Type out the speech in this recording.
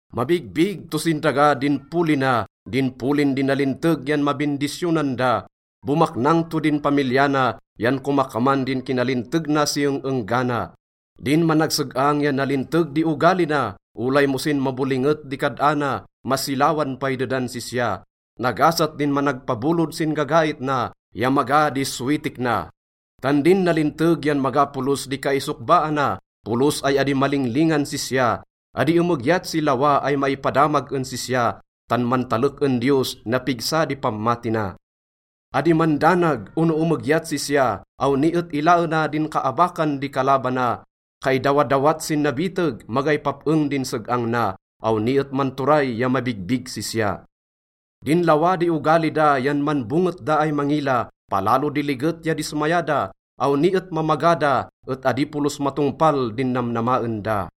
Mabigbig to sin daga din poli na, din polin di nalinteg yan mabindisyonan da. Bomaknang to din pamilya na, yan komakaman din kinalinteg na si eng-enggana. Din managseg-ang ya nalinteg di ogali na, olay mo sin mabolinget di kad-ana, masilawan pay dedan sisya. Nagasat din managpabolod sin gagait na ya maga di sowitik na. Tan din nalinteg yan maga polos di kaisokbaana, polos ay adi malinglingan sisya. Adi emegyat si lawa ay maipadamag en sisya, tan mantalek en Diyos, napigsa di pammati na. Adi mandanag ono emegyat sisya, awni et ilaena din kaabakan di kalabana. Kaidawadawat sin nabiteg, magay pap-eng din seg-ang na, awni et manturay ya mabigbig sisya. Din lawa di ogali da yan manbonget da ay mangila, palalo di liget ya dismaya da. Awni et mamaga da et adi polos matongpal din namnamaen da.